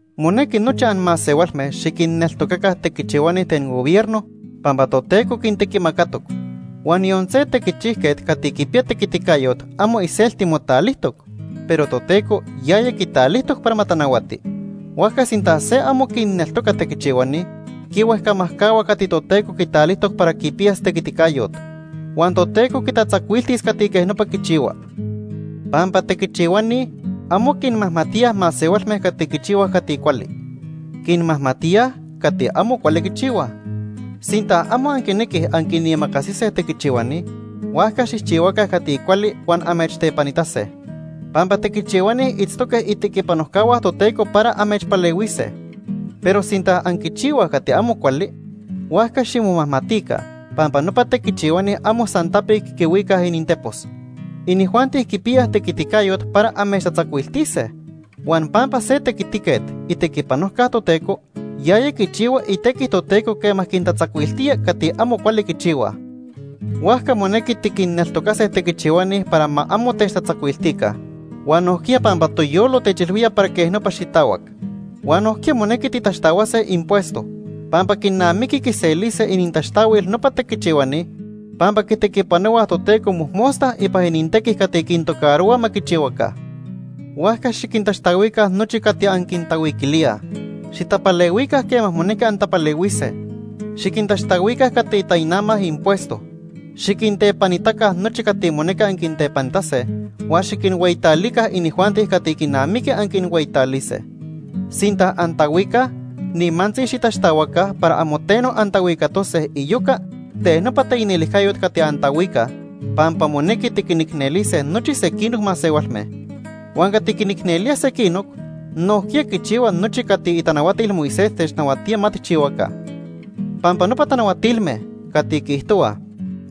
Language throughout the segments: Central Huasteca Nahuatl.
Monequi nochi anmasehualme xiquinneltocaca tequichihuani ten gobierno, pampa Toteco quintequimacatoc. Huan yon se tequichijquet cati quipiya tequiticayot amo iselti motalijtoc, pero Toteco yaya quitalijtoc para ma tanahuati. Huajca sinta se amo quinneltoca tequichihuani, quihuejcamajcahua cati Toteco quitalijtoc para quipiyas tequiticayot. Huan Toteco quitatzacuiltis cati quej nopa quichihua. Pampa tequichihuani amo quinmajmatíaj masehualme cati quichihuaj cati cuali, quinmajmatíaj cati amo cuali quichihuaj. Sinta amo anquinequij anquinimacasise tequichihuani, huajca xijchihuaca cati cuali huan amechtepanitase. Pampa tequichihuani itztoque itequipanojcahua Toteco para amechpalehuise. Pero sinta anquichihuaj cati amo cuali, huajca ximomajmatica pampa nopa tequichihuani amo san tapic quihuicaj inintepos. Inijuanti quipiyaj tequiticayot para amechtatzacuiltise. Huan pampa se tequitiquet itequipanojca Toteco, yaya quichihua itequi Toteco quema quintatzacuiltía cati amo cuali quichihuaj. Huajca monequi tiquinneltocase tequichihuani para ma amo techtatzacuiltica huan nojquiya pampa toyolo techilhuía para quej nopa xitahuac. Huan nojquiya monequi titaxtahuase impuesto. Pampa quinamiqui quiselise inintaxtahuil nopa tequichihuani pampa quitequipanohuaj Toteco mojmosta ipan inintequi cati quintocarohua ma quichihuaca. Huajca xiquintaxtahuica nochi cati anquintahuiquilíaj. Xitapalehuica quema monequi antapalehuise. Xiquintaxtahuica cati tainamaj impuesto. Xiquintepanitaca nochi cati monequi anquintepanitase. Huan xiquinhueyitalica inijuanti cati quinamiqui anquinhueyitalise. Sinta antahuicaj, nimantzi xitaxtahuaca para amo teno antahuicatose iyoca ten nopa taicnelijcayot cati antahuicaj, pampa monequi tiquinicnelise nochi sequinoc masehualme. Huan cati quinicnelía sequinoc, nojquiya quichihua nochi cati itanahuatil Moisés technahuatía ma tijchihuaca. Pampa nopa tanahuatilme cati quiijtohuaj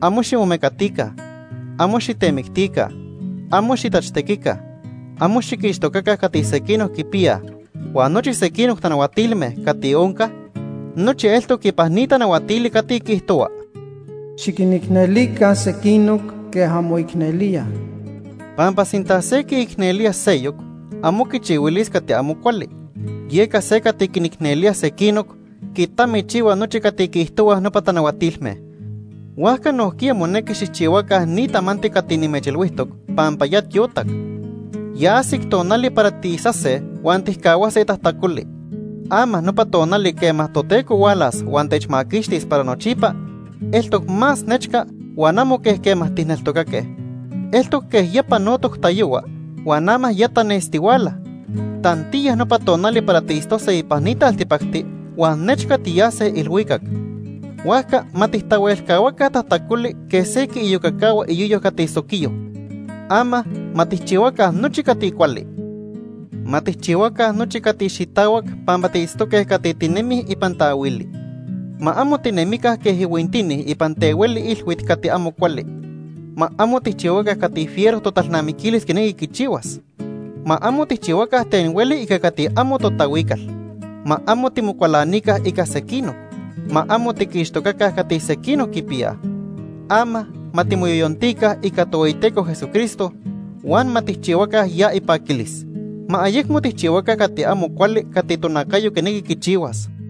amo ximomecatica, amo xitemictica, amo xitachtequica, amo xiquixtocaca cati sequinoc quipiyaj huan nochi sequinoc tanahuatilme cati oncaj, nochi eltoc ipan ni tanahuatili cati quiijtohua: “Xiquinicnelica sequinoc quej anmoicnelíaj.” Pampa sinta se quiicnelía seyoc, amo quichihuilis cati amo cuali. Yeca se cati quinicnelía sequinoc quitamichihua nochi cati quiijtohuaj nopa tanahuatilme. Huajca nojquiya monequi xijchihuaca ni tamanti cati nimechilhuijtoc pampa ya tiotac. Ya ajsic tonali para tiisase huan tijcahuase tajtacoli. Ama nopa tonali quema Toteco hualas huan techmaquixtis para nochipa, eltoc más nechca huan amo quej quema tijneltocaque. Eltoc quej ya panotoc tayohua huan ama ya tanestihuala. Tantiya nopa tonali para tiitztose ipan ni taltipacti huan nechca tiyase ilhuicac. Huajca ma tijtahuelcahuaca tajtacoli quej se quiiyocacahua iyoyo cati soquiyo. Ama ma tijchihuaca nochi cati cuali. Ma tijchihuaca nochi cati xitahuac pampa tiitztoque cati tinemij ipan taahuili. Ma amo tinemica quej ihuintini ipan tehueli ilhuit cati amo cuali. Ma amo tijchihuaca cati fiero totalnamiquilis quinequi quichihuas. Ma amo tijchihuaca ten hueli ica cati amo totahuical. Ma amo timocualanica ica sequinoc. Ma amo tiquixtocaca cati sequinoc quipiyaj. Ama ma timoyoyontica ica Tohueyiteco Jesucristo, huan ma tijchihuaca ya ipaquilis. Ma ayecmo tijchihuaca cati amo cuali cati tonacayo quinequi quichihuas.